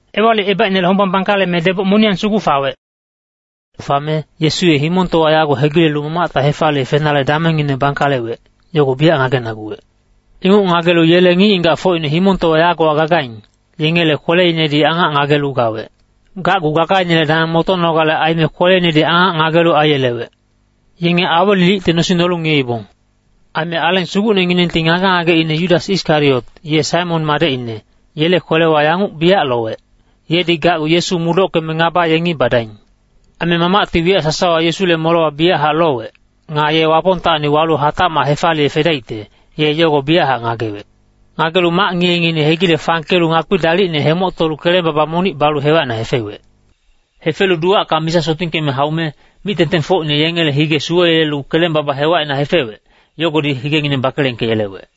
Ewalicebaicnele hombang bangkaleme deboc moniyang sugu fawec. Fame Yesu ye himongtowa yago hegilelu Mamacta hefaliye fenale damengngine bangkalewec, yogo biyac ngagenaguwec. Inguc ngagelu yele ngic-ngigacfocine himongtowa yagowa gagaing, yengele kweleinedi angac ngagelu gawec. Gacgu gagainele dameng motonogale aime kweleinedi angac ngagelu aiyelewec. Yenge awelilicte nosing nolu ngiyeibong. Aime Aleng Sugucnenginengti ngage-ngageine Yudas Iskariot, ye Saimon madecine, yele kwelewa yanguc biyac lowec, yedi gacgu Yesu mudockeme ngaba yengi badaing. Aime Mamacti wiyac sasawa Yesule molewa biyachac lowec. Nga ye Wapongtacni walu hatacmac hefaliye fedaicte, ye yogo biyachac ngagewec. Ngagelu mac ngiye-ngiyeine hegile fangkelu ngakpi dalicne hemoctolu keleng-baba monic balu hewacina hefewec. Hefelu duwacka misa sotingkeme haume, mic-tengtengfocine yengele hige suweyelelu keleng-baba hewacina hefewec, yogodi higengineng bakelengkeyelewec.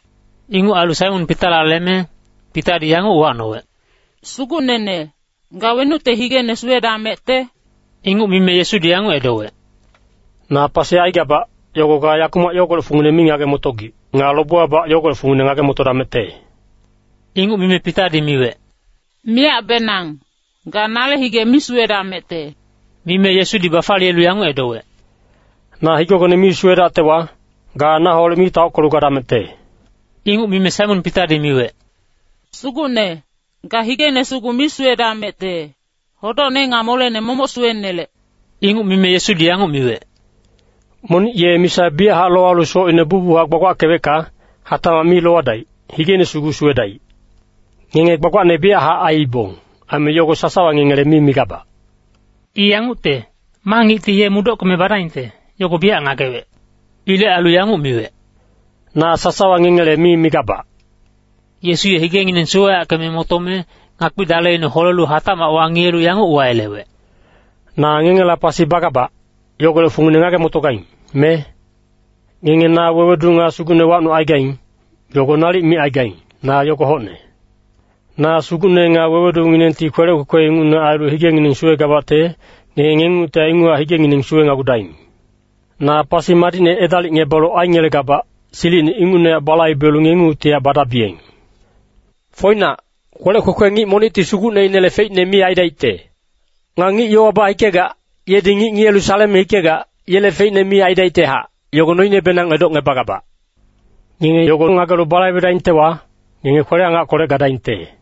Inguc ailu Saimon Pitala leme, Pitadi yanguc uwacnowec, “Sugucnene, ga wenucte higene suwedamecte?” Inguc mime Yesudi yanguc edowec, “Na pasi aigabac, yogo ga yakumac yogolec fungine mi ngage-motogic. Nga lobewabac yogolec fungine ngage-motodamecte.” Inguc mime Pitadi miwec, “Miyacbenang, ga nale hige mi suwedamecte.” Mime Yesudi bafaliyelu yanguc edowec, “Na higegone mi suwedactewa, ga naholec mi taockelu gadamecte.” Inguc mime Saimon Pitadi miwec, “Sugucne, ga higene sugu mi suwedamecte, hodocne nga molene momoc suwenelec.” Inguc mime Yesudi yanguc miwec, “Monic ye misa biyachac lowalu socine bucbuchac gbagbackewecka, hatacmac mi lowadaic, higeine sugu suwedaic. Ngenge gbagbacne biyachac aiibong, aime yogo sasawa ngengele mi migabac.” I yangucte, ma ngicti ye mudockeme badaingte, yogo biyac ngagewec. Ilec ailu yanguc miwec, “Na sasawa ngengele mi migabac.” Yesu ye higengineng suweyackeme motome, ngakpi daleine holelu hatacmac wangiyelu yanguc uwayelewec, “Na ngengela pasi bagabac, yogolec fungine ngage-motogaing, me? Ngenge na Wewedu nga Sugucne wacnucaigaing, yogo nalic micaigaing, na yogo hocne. Na Sugucne nga Wewedunginengti kwelec kwekwe ingucne ailu higengineng suwegabacte, ngenge ngengungtihac inguchac higengineng suwenagudaing. Na pasi madicne edalicngebalu aingelegabac, silicine ingucnehac balaibelu ngengungtihac badabiyeng. Foinac, kwelec kwekwe ngic monicti sugucneinele feicne mi aidaicte. Nga ngic yowa bahikegac, yedi ngic ngiyelu saleme hikegac, yele feicne mi aidaictehac, yogo noinebenang edocngebagabac. Ngenge yogo ngagelu balaibedaingtewa, ngenge kwele-angackolec gadaingte.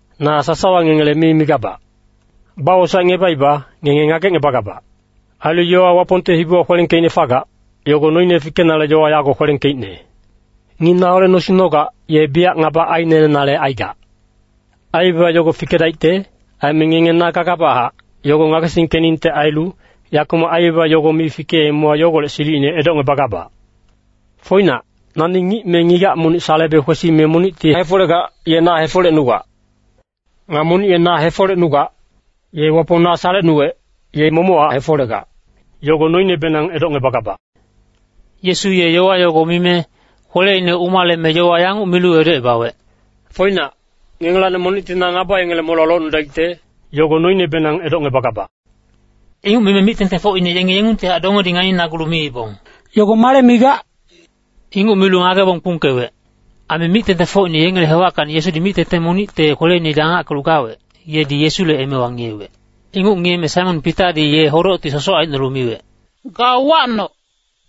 “Na sasawa ngengele mi migabac. Bawosaecngebaiba, ngenge ngagecngebagabac. Ailu yowa Wapongte hibiwa kwelengkeicne fagac, yogo noine fikenale yowa yago kwelengkeicne, ‘Ngic naholec nosing nogac, ye biyac ngaba ainelenale aigac.’ Aibaba yogo fikedaicte. Aime ngenge ‘Na gagabachac,’ yogo ngagesingkeningte ailu, yakumac aibaba yogo mi fikeemewa yogolec silicine edocngebagabac. Foinac, nani ngic me ngigac monic salebe kwesime monicti hefolegac, ye na hefolecnugac. Nga monic ye na hefolecnugac, ye Wapong na salecnuwec, ye momochac hefolegac, yogo noinebenang edocngebagabac.” Yesu ye yowa yogo mime, kweleine umaleme yowa yanguc milu edocebawec, “Foinac, ngengelacni monicti na ngaba yengele molewa locnudaicte, yogo noinebenang edocngebagabac.” Inguc mime mic-tengtengfocine yenge yengungtihac dongedi nganinagulu miibong, “Yogo male migac?” Inguc milu ngagebong kpungkewec. Aime mic-tengtengfocine yengele hewackacni Yesudi mic-tengteng monicte kweleinedi angackelu gawec, yedi Yesule emewa ngiyewec. Inguc ngiyeme Saimon Pitadi ye hodocti sosoc aicnolu miwec, “Ga uwacnoc,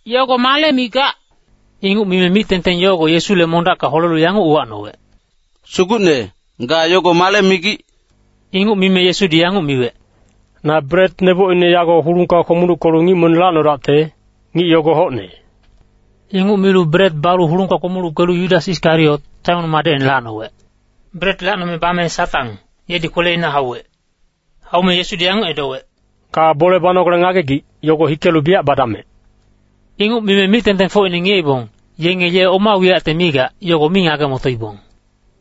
yogo male migac?” Inguc mime mic-tengteng yogo Yesule mondacka holelu yanguc uwacnowec, “Sugucne, ga yogo male migic?” Inguc mime Yesudi yanguc miwec, “Na bret nebocine yago hulungka kpomuluckelu ngic monic lacnodacte, ngic yogo hocne.” Inguc milu bret balu hulungka kpomuluckelu Yudas Iskariot, Saimon madecine lacnowec. Bret lacnome bame Satang, yedi kweleina hauwec. Haume Yesudi yanguc edowec, “Ga bole banogale ngagegic, yogo hikelu biyac badamec.” Inguc mime mic-tengtengfocine ngiyeibong, yenge ye oma wiyacte migac, yogo mi ngage-motoibong.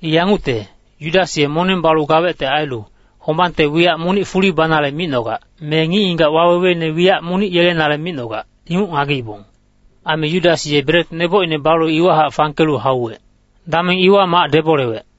I yangucte, Yudas ye moneng balu gawecte ailu, hombangte wiyac monic fuli banale micnogac, me ngic-ngigac waweweine wiyac monic yelenale micnogac, inguc ngageibong. Aime Yudas ye bret nebocine balu iwahac fangkelu hauwec. Dameng iwa mac debolewec.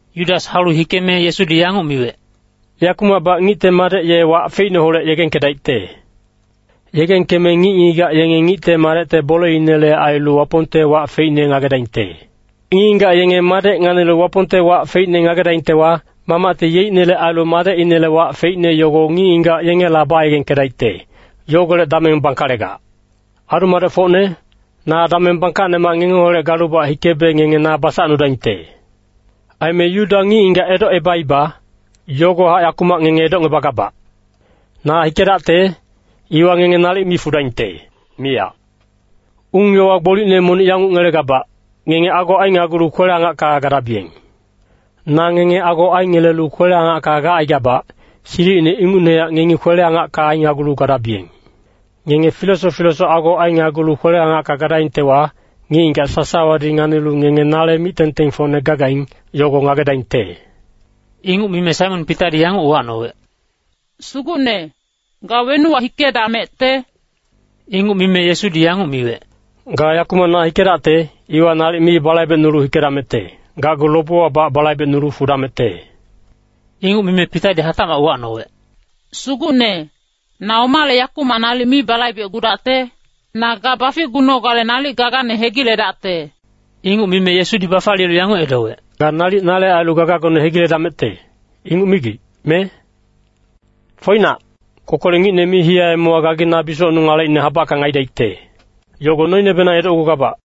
Yudas haulu hikeme Yesudi yanguc miwec, “Yakumacbac Ngicte Madec ye wac feicneholec yegengkedaicte. Yegengkeme ngic-ngigac yenge Ngicte Madecte boleinele ailu Wapongte wac feicne ngagedaingte. Ngic-ngigac yenge Madec nganilu Wapongte wac feicne ngagedaingtewa, Mamacti yeicnele ailu Madecinele wac feicne yogo ngic-ngigac yengela bayegengkedaicte, yogolec dameng bangkalegac. Adu-madecfocne, na dameng bangkacnemac ngengeholec galubac hikebe ngenge na basacnudaingte. Aime Yuda ngic-ngigac edocebaiba, yogohac yakumac ngenge edocngebagabac. Na hikedacte, iwa ngenge nalic mi fudaingte, miyac. Ung-yowa gbolicne monic yanguc ngelegabac, ngenge ago ainagulu kwele-angacka gadabiyeng. Na ngenge ago aingelelu kwele-angacka gacaigabac, silicine ingucnehac ngengi kwele-angacka ainagulu gadabiyeng. Ngenge filesoc filesoc ago ainagulu kwele-angacka gadaingtewa, ngic-ngigac sasawadi nganilu ngenge nale mic-tengtengfocne gagaing, yogo ngagedaingte.” Inguc mime Saimon Pitadi yanguc uwacnowec, “Sugucne, ga wenuwa hikedamecte?” Inguc mime Yesudi yanguc miwec, “Ga yakumac na hikedacte, iwa nalic mi balaibecnulu hikedamecte, gacgu lobewabac balaibecnulu fudamecte.” Inguc mime Pitadi hatacmac uwacnowec, “Sugucne, na omale yakumac nalic mi balaibecgudacte? Na ga baficgunogale nalic gagane hegiledacte.” Inguc mime Yesudi bafaliyelu yanguc edowec, “Ga nalic nale ailu gagagone hegiledamecte, inguc migic, me? Foinac, kokolec ngicne mi hiyaemewa, gagi na bisocnung alecine habackang aidaicte, yogo noinebenang edocgugabac.”